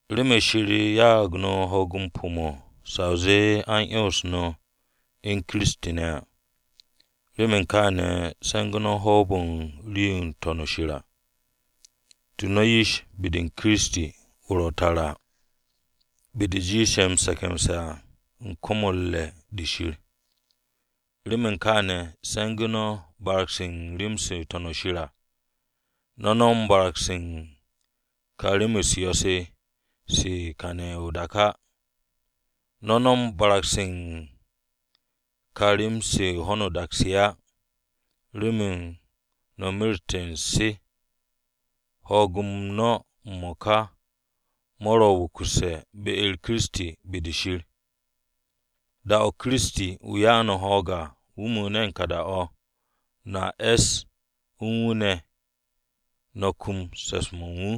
Remen Shir ya'ag no̱ ho̱o̱g-m pu̱-mo̱ sa o zee a u̱n 'yons no̱ u̱n Kiristi ne̱ à, remen kaane̱ se̱ngu̱ no̱ hoob u̱n ka rii-yo ro̱ n-To̱n shir à. Tu no̱ yish be-de Kiristi ro̱ tara à be-de jiishe̱ m-se̱ke̱mse̱ à u̱n kom-o̱ u̱r-re̱ de Shir. Remen kaane̱, se̱ngu̱ no̱ barag-se u̱n rem-se ro̱ n-To̱n shir à. No̱ no̱m barag-se u̱n ka rem-u̱s yo̱-se se u̱n kàne̱ u̱n o-dak á. No̱ no̱m barag-se u̱n ka rem-se u̱n ho̱no o-dak se á, remen no̱ mereste̱ u̱n se, ho̱o̱g-m no̱ m-mo̱ka mo̱ ro̱ wukusse̱ be-u̱r Kiristi be-de Shir. Da-o̱ Kiristi, wu̱ ya'u̱ no̱ ho̱o̱g à, wu̱ mu̱u̱ne̱ u̱n ka da-o̱, no̱a es u̱n wu̱ ne̱ no̱ kum se̱ps-mo̱ u̱n wu̱.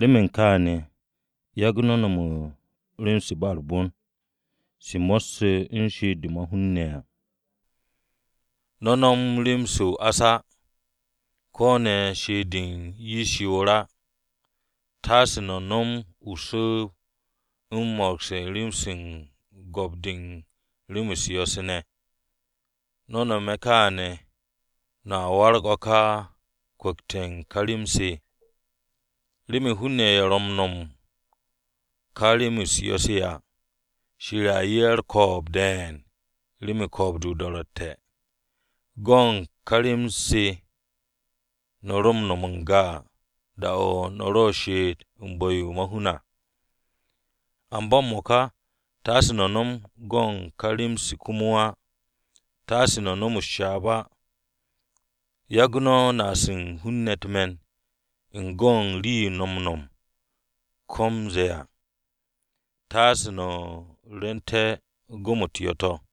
Remen kaane̱ yagu̱ no̱ no̱m u̱n rem-se ba u̱r-bon, se mo̱sse̱ u̱n she'et-de ma-hun ne̱ à. No̱ no̱m rem-se o-ás á, ko̱ ne̱ she'et-de u̱n yish o-yoor á. Taase no̱ nom su̱u̱b-o̱ u̱n mo̱ro̱gse̱ u̱s-rem u̱n go̱p-de u̱n rem-u̱s yo̱-se ne̱. No̱ nome̱ kaane̱, no̱ waragte̱ o̱ ka kwu̱kte̱ u̱n ka rem-se. Remen hun-ne̱ ye̱ ro̱ m-no̱m u̱n ka rem-u̱s yo̱-se se à, Shir a 'ye ye̱ u̱r-ko̱o̱b de̱e̱n remen ko̱o̱b-de o-do̱ro̱tte̱. Go̱n ka rem-se no̱ ro m-no̱m n-ga da-o̱ no̱ ro u̱r-she'et u̱n bu̱-yo ma-hun à. Amba m-mo̱ka taase no̱ nom go̱n ka rem-se komo á. Taase no̱ nom u̱s-ryaab á. Yagu̱ no̱ naas u̱n hun-ne̱ u̱t-me̱n u̱n go̱n rii-yo no̱ m-no̱m ko̱ m-ze̱e̱ à. Taase no̱ rwu̱u̱nte̱ go̱m-u̱t yo̱-to̱.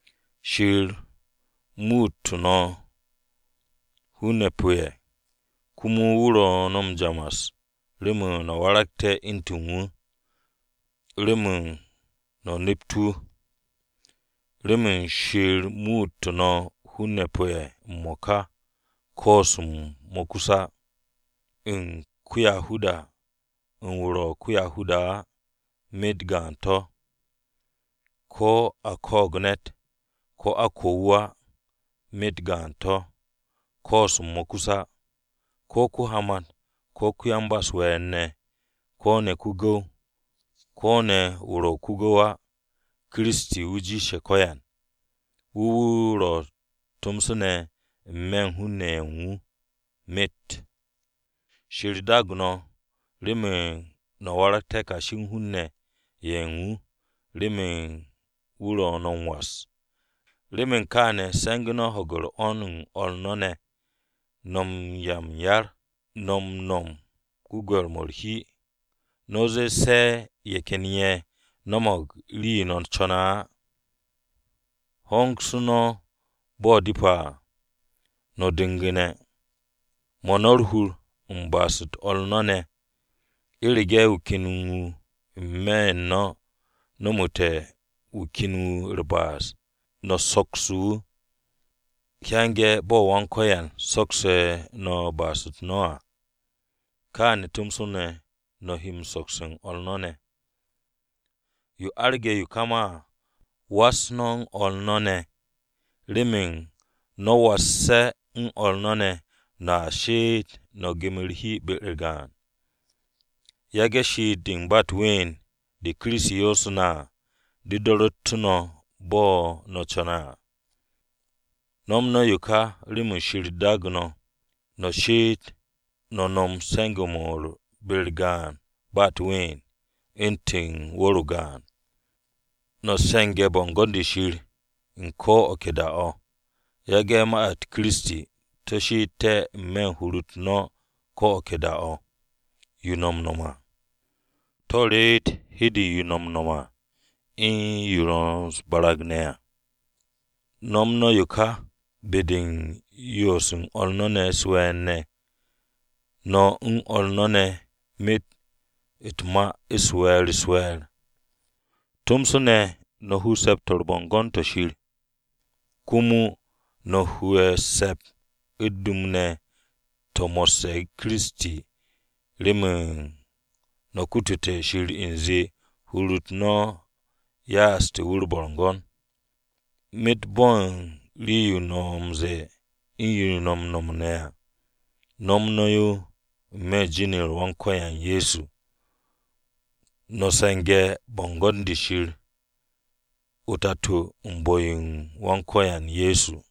Shir muutu̱ no̱ hun-ne̱ pu̱-ye̱ komo wu̱ ro̱ no̱ m-jamas remen no̱ waragté̱ u̱ntu̱n wu̱, remen no̱ nept wu̱ o-nip. Remen Shir muutu̱ no̱ hun-ne̱ pu̱-ye̱ m-mo̱ka koos-m mo̱ kus á. U̱n ko-Yahuda, u̱n wu̱ ro̱ ko-Yahuda á, myet gaan-to̱. Ko̱ a ko̱o̱g ne̱t, ko̱ a ko̱ wu̱ á, myet gaan-to̱. Koos-m mo̱ kus á, ko̱ ko-hamat ko̱ ko-yan-ba-u̱s-we̱e̱r ne̱, ko̱ ne̱ ko-gu̱w, ko̱ ne̱ wu̱ ro̱ ko-gu̱w á. Kiristi wu̱ jiishe̱ ko̱yan, wu̱ wu̱ ro̱ tomso ne̱ n-me̱ u̱n hun-ne̱ ye̱ u̱n wu̱ myet. Shir daagu̱ no̱ remen no̱ waragté̱ kashi hun-ne̱ ye̱ u̱n wu̱ remen wu̱ ro̱ no̱ m-was. Remen kaane̱ se̱ngu̱ no̱ ho̱ge̱ 'wo̱n-u̱r o̱r no̱ ne̱, no̱ u̱n 'ya m-yar, no̱ nom gwu̱gwe̱r-mo̱ u̱r-hi, no̱ ze̱e̱ se̱ ye̱ ken ye̱ no̱mo̱g rii-yo no̱ co̱ne̱ á. Hongsu̱ no̱ bo̱ depe̱ à no̱ du̱ngu̱ne̱. 'Mo̱ no̱ u̱r-hur u̱n ba'as-u̱t o̱r no̱ ne̱. U̱rege̱ wu̱ ken wu̱ n-me̱ no̱ nomote̱ wu̱ ken wu̱ u̱r-ba'as, no̱ sokse̱ wu̱. Hyange̱ bo̱ Wan-Ko̱yan soksu̱ no̱ ba'as-u̱t no̱ à, kaane̱ tomso no̱ he sokse̱ u̱n o̱r no̱ ne̱. Yo arge̱ yo ka ma à, was no̱ o̱r no̱ ne̱. Remen no̱ wasse̱ o̱r no̱ ne̱, no̱a she'et no̱ gem u̱r-hi be-u̱r gaan. Yage̱ she'et-de u̱n ba u̱t-ween de Kiristi yoosu̱ no̱ à, de do̱ru̱ttu̱ no̱ bo̱ no̱ co̱ne̱ à. Nom no̱ yo ka remen Shir daagu̱ no̱, no̱ she'ete̱ no̱ nom m-se̱nge̱ be-u̱r gaan ba u̱t-ween u̱ntu̱n wu̱r-o gaan. No̱ se̱nge̱ bo̱ngo̱n-de Shir u̱n ko̱ o̱ ke da-o̱. Yage̱ ma-u̱t Kiristi to̱ she'ete̱ n-me̱ u̱n hur-u̱t no̱ ko̱ o̱ ke da-o̱, to̱ reet hi-de u̱n yo no̱ m-nom à u̱n yo no̱ u̱s-barag ne̱ à. No̱m no̱ yo ka be-de u̱n yoose̱ u̱n o̱r no̱ ne̱ u̱s-we̱e̱r ne̱, no̱ u̱n o̱r no̱ ne̱ myet u̱t-ma we̱e̱r-u̱s-we̱e̱r. Tomso ne̱, no̱ u̱n hu u̱n Se̱p-to̱ u̱r-Bo̱ngo̱n to̱ Shir, komo no̱ hu'e̱ u̱t-se̱p, u̱t-dum ne̱ to̱ mo̱sse̱ Kiristi remen no̱ kututé̱ Shir u̱nze hur-u̱t no̱ ya'ase̱ wu̱ u̱r-bo̱ngo̱n. Myet bo̱ u̱n rii-yo no̱ m-ze̱e̱ u̱n yo no̱ m-nom ne̱ à, nom no̱ yo n-me̱ u̱n jin-u̱r Wan-Ko̱yan Ye̱so. No̱ se̱nge̱ bo̱ngo̱n-de Shir o-Tato u̱n bu̱-yo u̱n Wan-Ko̱yan Ye̱so.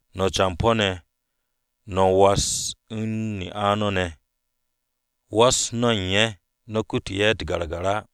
No̱ campo̱-ne̱, no̱ was u̱n ne'a no̱ ne̱. Was no̱ ye̱ no̱ kutu̱ ye̱ u̱t-gagar á.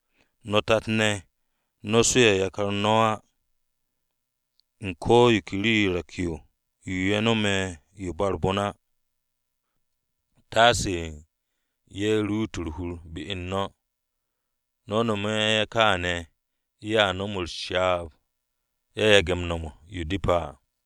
No̱ tat-ne̱, no̱ su'e̱ yakar no̱ á, u̱n ko̱ yo ke rii re̱k-yo yo ye̱ nome̱ yo ba u̱r-bon á, taasu̱ ye̱ ruut u̱r-hur be-u̱r no̱. No̱ nome̱ ye̱ kaane̱ ye̱a nom u̱s-ryaab ye̱ yage̱ nom u̱n yo depe̱ à.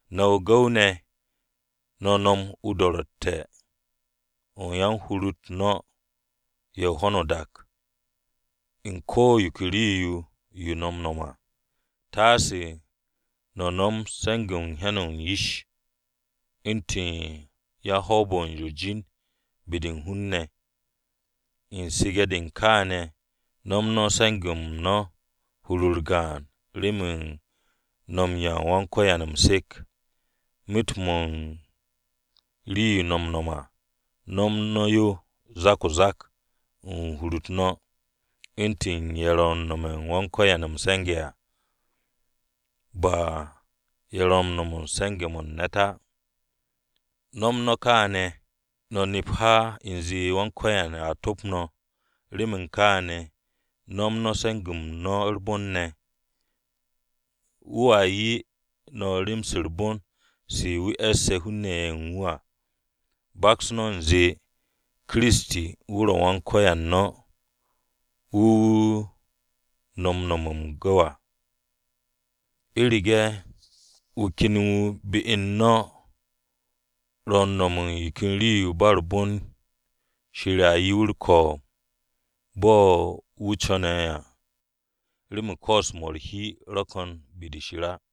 No̱ gu̱w-ne̱, no̱ nom o-do̱ro̱tte̱ o̱ u̱n yan-hur-u̱t no̱ ye̱ u̱n ho̱no o-dak, u̱n ko̱ yo ke rii-yo yo no̱ m-nom à. Taase no̱ nom se̱nge̱-mo̱ u̱n hyan-o̱ u̱n yish, u̱ntu̱n yan-hoob-o̱ u̱r-jin be-de u̱n hun-ne̱, u̱n su̱ge̱-de u̱n kaane̱ nom no̱ se̱nge̱-m no̱ hur-u̱r gaan, remen no̱ m-'ya u̱n Wan-Ko̱yan m-se̱k. Myet-mo̱ u̱n rii-yo no̱ m-nom à, nom no̱ yo zak-o-zak u̱n hur-u̱t no̱, u̱ntu̱n ye̱ ro̱ m-nome̱ u̱n Wan-Ko̱yan m-se̱nge̱ à. Ba ye̱ ro̱ m-se̱nge̱ remen ne̱t á. No̱m no̱ kaane̱, no̱ nep ha u̱nze Wan-Ko̱yan Ye̱so a top no̱. Remen kaane̱, nom no̱ se̱nge̱-m no̱ u̱r-bon ne̱. Wu̱a 'ye no̱ rem-se u̱r-bon se wu̱ e̱sse̱ hun-ne̱ ye̱ u̱n wu̱ à. Baks no̱ u̱nze Kiristi wu̱ ro̱ Wan-Ko̱yan no̱ wu̱ no̱ m-nome̱ m-gu̱w à. U̱rege̱ wu̱ ken wu̱ be-u̱r no̱ ro̱ u̱n nom u̱n rii-yo ba u̱r-bon, Shir a 'ye wu̱ u̱r-ko̱o̱b bo̱ wu̱ co̱ne̱ à. Remen koos-mo̱ u̱r-hi ro̱ ko̱n be-de Shir á.